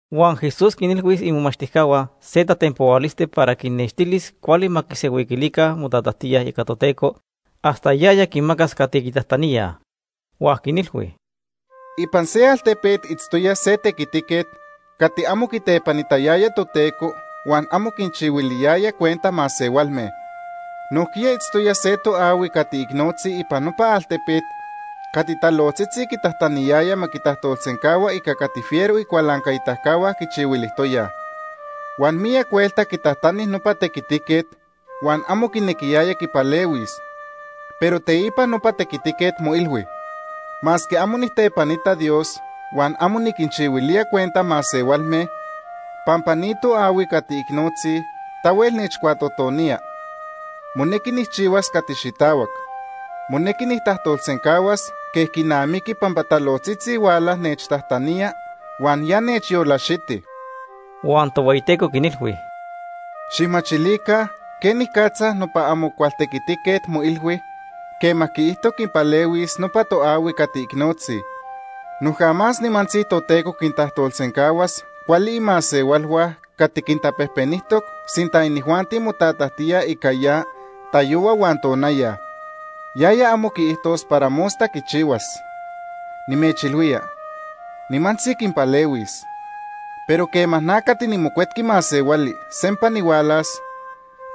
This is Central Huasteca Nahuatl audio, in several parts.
Huan Jesús quinilhui imomachtijcahua se tatenpohualisti para quinnextilis cuali ma quisenhuiquilica motatajtíaj ica Toteco hasta yaya quinmacas cati quitajtaníaj. Huan quinilhui: “Ipan se altepet itztoya se tequitiquet cati amo quitepanitayaya Toteco huan amo quinchihuiliyaya cuenta masehualme. Nojquiya itztoya se toahui cati icnotzi ipan nopa altepet cati talojtzitzi quitajtaniyaya ma quitajtolsencahua ica cati fiero icualancaitacahua quichihuilijtoyaj. Huan miyac huelta quitajtani nopa tequitiquet huan amo quinequiyaya quipalehuis, pero teipa nopa tequitiquet moilhui: ‘Masque amo nijtepanita Dios huan amo niquinchihuilía cuenta masehualme, pampa ni toahui cati icnotzi tahuel nechcuatotonía, monequi nijchihuas cati xitahuac. Monequi nijtajtolsencahuas quej quinamiqui pampa talojtzitzi huala nechtajtanía, huan ya nechyolaxiti.’” Huan Tohueyiteco quinilhui: “Xijmachilica quenicatza nopa amo cual tequitiquet moilhui quema quiijto quipalehuis nopa toahui cati icnotzi. Noja más nimantzi Toteco quintajtolsencahuas cuali imasehualhua cati quintapejpenijtoc sinta inijuanti motatajtíaj ica ya tayohua huan tonaya. Yaya amo quiijtos para mosta quichihuas. Nimechilhuía, nimantzi quinpalehuis. Pero quema na cati niMocuetqui Masehuali sempa nihualas,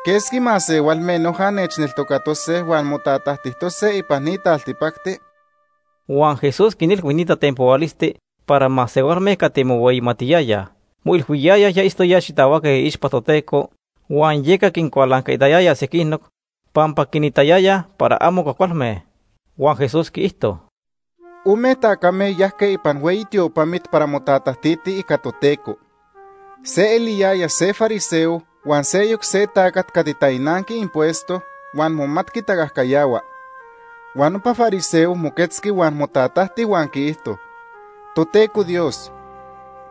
¿quesqui masehualme noja nechneltocatose huan motatajtijtose ipan ni taltipacti?” Huan Jesús quinilhui ni tatenpohualisti para masehualme cati mohueyimatiyayaj. Moilhuiyayaj ya itztoyaj xitahuaque iixpa Toteco, huan yeca quincualancaitayayaj sequinoc pampa quinitayayaj para amo cuajcualme. Huan Jesús quiijto: “Ome tacame yajque ipan hueyi tiopamit para motatajtitij ica Toteco. Se eliyaya se fariseo huan seyoc se tacat cati tainanqui impuesto huan momatqui tacajcayahua. Huan nopa fariseo moquetzqui huan motatajti huan quiijto: ‘Toteco Dios,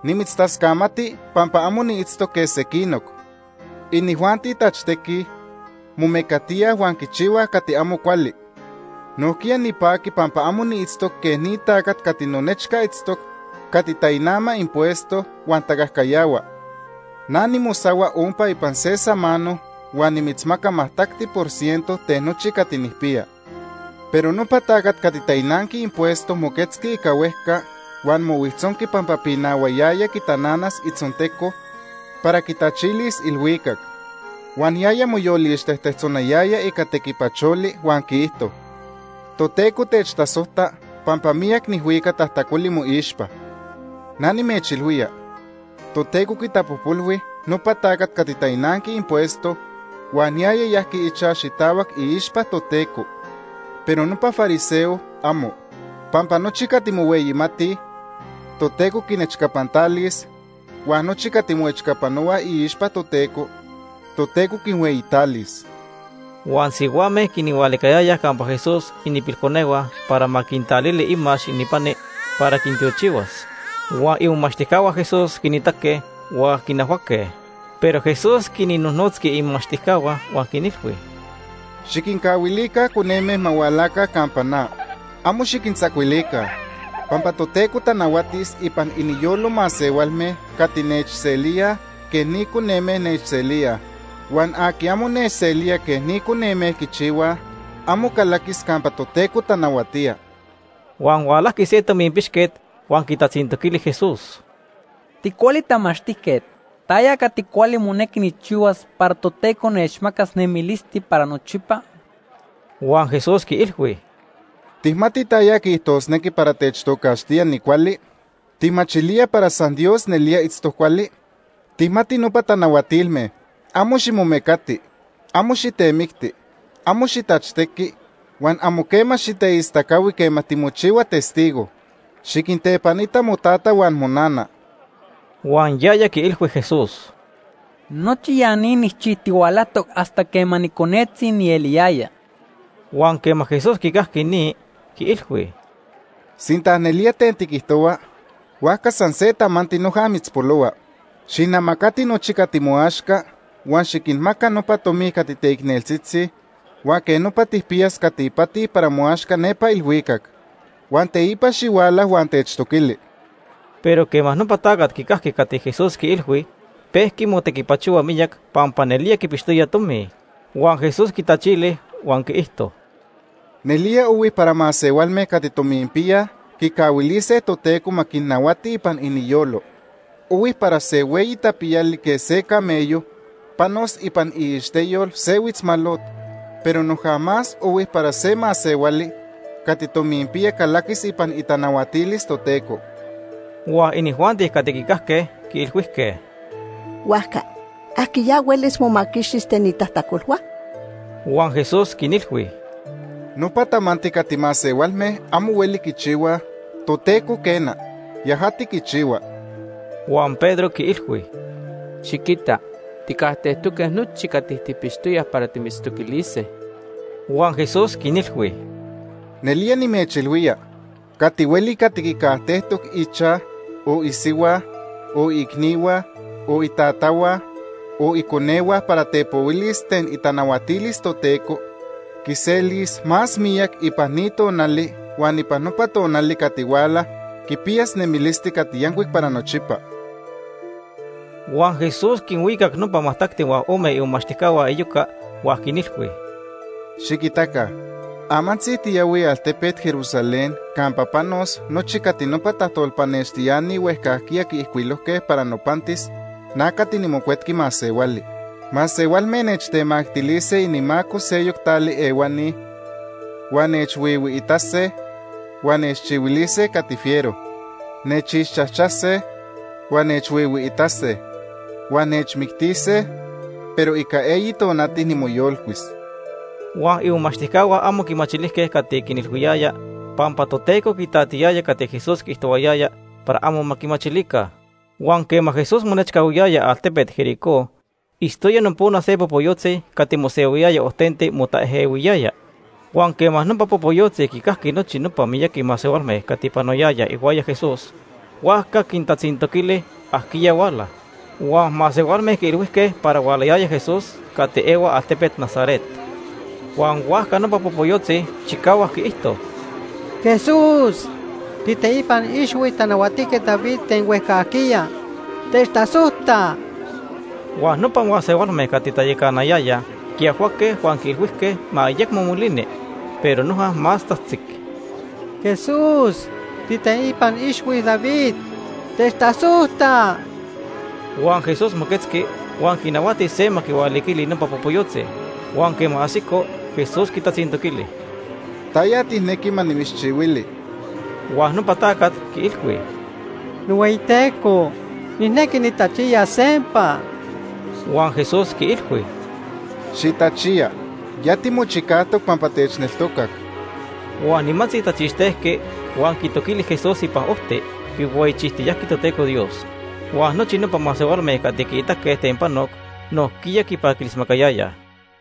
nimitztascamati pampa amo niitztoc quej sequinoc. Inijuanti tachtequij, momecatíaj huan quichihuaj cati amo cuali. Nojquiya nipaqui pampa amo niitztoc quej ni tacat cati nonechca itztoc cati tainama impuesto huan tacajcayahua. Na nimosahua ompa ipan se samano huan nimitzmaca majtacti por ciento ten nochi cati nijpiya.’ Pero nopa tacat cati tainanqui impuesto moquetzqui ica huejca huan mohuijtzonqui pampa pinahuayaya quitananas itzonteco para quitachilis ilhuicac. Huan yaya moyolixtejtetzonayaya ica tequipacholi huan quiijto: ‘Toteco techtasojta pampa miyac nijhuica tajtacoli moixpa.’ Na nimechilhuía, Toteco quitapojpolhui nopa tacat cati tainanqui impuesto huan yaya yajqui ichaj xitahuac iixpa Toteco, pero nopa fariseo, amo. Pampa nochi cati mohueyimatij, Toteco quinechcapantalis huan nochi cati moechcapanohuaj iixpa Toteco, Toteco quinhueyitalis.” Huan sihuame quinhualicayayaj campa Jesús ininpilconehua para ma quintalili imax ininpani para quintiochihuas. Huan imomachtijcahua Jesús quinitaque huan quinajhuaque. Pero Jesús quinnojnotzqui imomachtijcahua huan quinilhui: ―Xiquincahuilica coneme ma hualaca campa na. Amo xiquintzacuilica, pampa Toteco tanahuatis ipan iniyolo masehualme cati nechselíaj quej ni coneme nechselíaj. Huan aqui amo nechselía quej ni coneme quichihuaj, amo calaquis campa Toteco tanahuatía. Huan hualajqui se tominpixquet huan quitatzintoquili Jesús: ―Ticuali tamachtijquet, ¿taya cati cuali monequi nijchihuas para Toteco nechmacas nemilisti para nochipa? Huan Jesús quiilhui: ―¿Tijmati taya quiijtosnequi para techtocaxtía nicuali? ¿Tijmachilía para san Dios nelía itztoc cuali? Tijmati nopa tanahuatilme: ‘Amo ximomecati, amo xitemicti, amo xitachtequi, huan amo quema xiteistacahui quema timochihua testigo. Xiquintepanita motata huan monana.’ Huan yaya quiilhui Jesús: ―Nochi ya ni nijchijtihualajtoc hasta quema niconetzi nieliyaya. Huan quema Jesús quicajqui ni, quiilhui: ―Sinta nelía ten tiquijtohua, huajca san se tamanti noja mitzpolohua. Xijnamacati nochi cati moaxca huan xiquinmaca nopa tomi cati teicneltzitzi huan quej nopa tijpiyas cati ipati para moaxca nepa ilhuicac. Huan teipa xihuala huan techtoquili. Pero quema nopa tacat quicajqui cati Jesús quiilhui, pejqui motequipachohua miyac pampa nelía quipixtoya tomi. Huan Jesús quitachili huan quiijto: ―Nelía ohui para masehualme cati tominpiyaj quicahuilise Toteco ma quinnahuati ipan iniyolo. Ohui para se hueyi tapiyali quej se camello panos ipan iixteyol se huitzmalot, pero noja más ohui para se masehuali cati tominpiya calaquis ipan itanahuatilis Toteco. Huan inijuanti cati quicajque quiilhuijque: ―Huajca ¿ajquiya huelis momaquixtis ten itajtacolhua? Huan Jesús quinilhui: ―Nopa tamanti cati masehualme amo hueli quichihuaj, Toteco quena, yajati quichihua. Huan Pedro quiilhui: ―Xiquita, tijcajtejtoque nochi cati tijpixtoyaj para timitztoquilise. Huan Jesús quinilhui: ―Nelía nimechilhuía cati hueli cati quicajtejtoc ichaj, o isihua, o iicnihua, o itatahua, o iconehua para tepohuilis ten itanahuatilis Toteco, quiselis más miyac ipan ni tonali huan ipan nopa tonali cati huala, quipiyas nemilisti cati yancuic para nochipa. Huan Jesús quinhuicac nopa majtacti huan ome imomachtijcahua iyoca huan quinilhui: “Xiquitaca, amantzi tiyahuij altepet Jerusalén campa panos nochi cati nopa tajtolpanextiani huejcajquiya quiijcuilojque para nopantis na cati niMocuetqui Masehuali. Masehualme nechtemactilise inimaco seyoc tali ehuani huan nechhuihuiitase huan nechchihuilise cati fiero. Nechixchajchase, huan nechhuijhuitequise, huan nechmictise, pero ica eyi tonati nimoyolcuis.” Huan imomachtijcahua amo quimachilijque cati quinilhuiyaya pampa Toteco quitatiyaya cati Jesús quiijtohuayaya para ma amo quimachilica. Huan quema Jesús monechcahuiyaya altepet Jericó, itztoya nopona se popoyotzi cati mosehuiyaya ojtenti motaejehuiyaya. Huan quema nopa popoyotzi quincajqui nochi nopa miyaqui masehualme cati panoyayaj ihuaya Jesús, huajca quintatzintoquili ajquiya huala. Huan masehualme quiilhuijque para hualayaya Jesús cati ehua altepet Nazaret. Huan huajca nopa popoyotzi chicahuac quiijto: ―¡Jesús, tiiteipan ixhui Tanahuatijquet David ten huejcajquiya, techtasojta! Huan nopa masehualme cati tayacanayayaj quiajhuaque huan quiilhuijque ma ayecmo molini, pero noja más tzajtzic: ―¡Jesús tiiteipan ixhui David, techtasojta! Huan Jesús moquetzqui huan quinahuati se ma quihualiquili nopa popoyotzi. Huan quema ajsico, Jesús quitatzintoquili: ―¿Taya tijnequi ma nimitzchihuili? Huan nopa tacat quiilhui: ―NohueyiTeco, nijnequi nitachiyas sempa. Huan Jesús quiilhui: ―¡Xitachiya! Ya timochicajtoc pampa techneltocac. Huan nimantzi tachixtejqui, huan quitoquili Jesús ipan ojti, quihueyichijtiyajqui Toteco Dios. Huan nochi nopa masehualme cati quiitaque ten panoc nojquiya quipaquilismacayayaj.